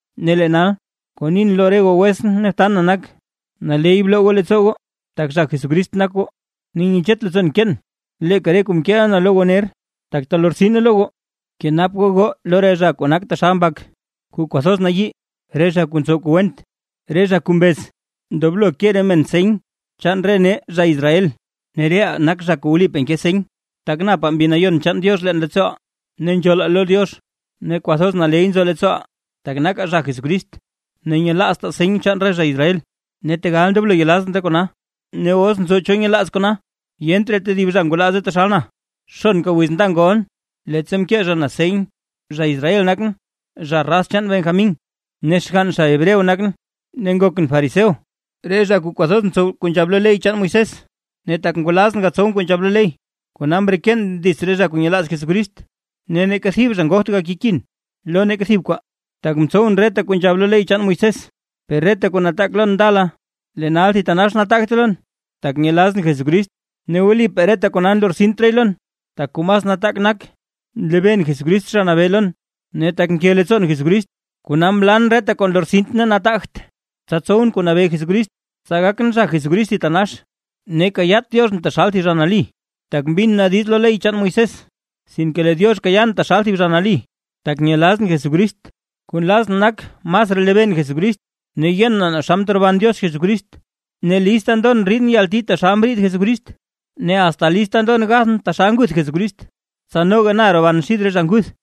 Ne lee nal, kuu nin lo re goo wetsʼn ne btan na nak, naley bloo goo leettsoo goo tak zha Jesucrist nak goo. Ne nyechet leettsoon nkeen leeka re kuu mkeeʼa na lo goo ner, tak talortsine lo goo. Bkenap goo goo lo re zha kuu nak taxal mbak kuu kwathoz nayii, re zha kuu ntsow kuu went, re zha kuu mbez ndoblo ke re men seny chaan re nee, zha Israel. Ne reʼaa nak zha kuu wlipaa nke seny, tak napaa Mbi Nayon chaan Diox leen leettsooʼaa, ne nzhoolaa lo Diox ne kwathoz naley nzo leettsooʼaa, tak nakaa zha Jesucrist, ne nyelaaztaa seny chaan re zha Israel, ne tegal ndoblon yelaazʼn re kona. Ne os nzo cho nyelaaz kona, ¡yent raa tedib zha ngwalaaze taxal na! Xonka wiz nda ngolʼn leettsa mkee zha senyʼn; zha Israel nakʼn, zha raz chaan Benjamín, ne xgann zha Hebreo nakʼn. Ne ngokʼn fariseo, re zha kuu kwathoz ntsow kuu nzhab lo ley chaan Moisés. Ne tak ngwalazʼn gatsowʼn kuu nzhab lo ley, kona mreken dits re zha kuu nyelaaz Jesucrist, ne neeka thib zha ngogt gakekin lo neeka thib kwaa, tak mtsowʼn reta kuu nzhab lo ley chaan Moisés. Per reta kuu nataak lon ndala, lee nal thitanax nataagte lon, tak nyelazʼn Jesucrist. Ne wlipaa reta kona nlortsint raay lon, tak kuu mas nataak nak nlebeen Jesucrist Zha Nabee lon. Ne tak nke leettsoon Jesucrist, kona mlan reta kuu nlortsint ne nataagt, tsa tsowʼn kuu nabee Jesucrist, tsa gakʼn zha Jesucrist thitanax. Ne kayaat Dioxʼn taxal thib zha nali tak mbin na diiz lo ley chaan Moisés, sinke lee Diox kayaan taxal thib zha nali, tak nyelazʼn Jesucrist. Kuu nlazʼn nak masraa lebeen Jesucrist, ne yen naa xa mteroban Diox Jesucrist. Ne lista ndon riidʼn yalti taxal mriid Jesucrist, ne asta lista ndon gathʼn taxal nguth Jesucrist, tsa noga na roban xid re zha nguth.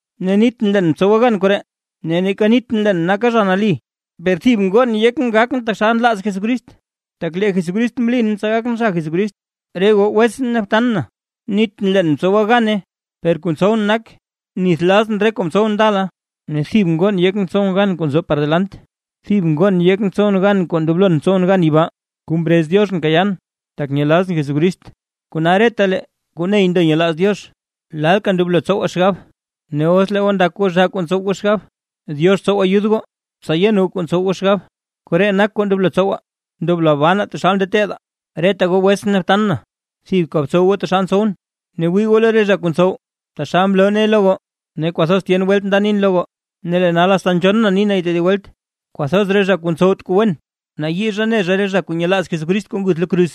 Ne nitʼn leen mtsowa na gan koree ne neeka nitʼn leen naka na zha nali, per thib ngon yekʼn gakʼn taxal nlaaz Jesucrist, tak lee Jesucrist mlin tsa gakʼn zha Jesucrist. Re goo wetsʼn ne btan na, nitʼn leen mtsowa na gane; per kuu ntsowʼn nak nithlazʼn re kuu mtsowʼn ndala, ne thib ngon yekʼn tsowʼn gan kuu nzo par par delant. Thib ngon yekʼn tsowʼn gan kuu ndoblon tsowʼn gan yibaa, kuu mrez Dioxʼn kayaan tak nyelazʼn Jesucrist. Kona retalee kuu ney ndo nyelaaz Diox, lalka ndoblo tsowaa xgab; ne os lee goo ndak goo zhaa kuu ntsow goo xgab, Diox tsow ayud goo tsa yen goo kuu ntsow goo xgab. Koree nak kuu ndoblo tsowaa. ¡Ndoblo banaa taxal mteedaa! Reta goo wetsʼn ne btan na, thibka btsow goo taxal ntsowʼn, ne wii goo lo re zha kuu ntsow taxal mloo nee lo goo. Ne kwathoz tyen welt nda nin lo goo, ne lee nal asta nzhonn na ni nay tedib welt: Kwathoz re zha kuu ntsowt kuu wen, nayii zha ne zha re zha kuu nyelaaz Jesucrist kuu nguth lo kruz.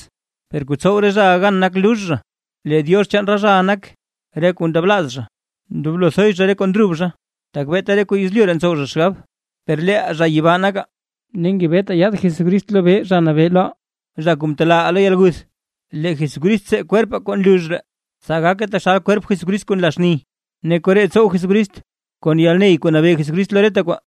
Per kuu tsow re zhaʼa gan nak lux zha. Lee diox chaan re zhaʼa nak re kuu ndablaaz zha, ndoblo thoy zha re kuu ndrub zha, tak beeta re kuu yezlyu ree ntsow zha xgab. Per leeʼaa zha yibaa nakaa, ne ngebetaa yaad Jesucrist lobee Zha Nabee loʼaa, zha kuu mtelaaʼaa lo yalguth. Lee Jesucrist tsee kwerpaa kuu nlux ree, tsa gake taxal kwerp Jesucrist kuu nla xni. Ne koree tsow Jesucrist kon yalney kuu nabee Jesucrist lo reta kwaa.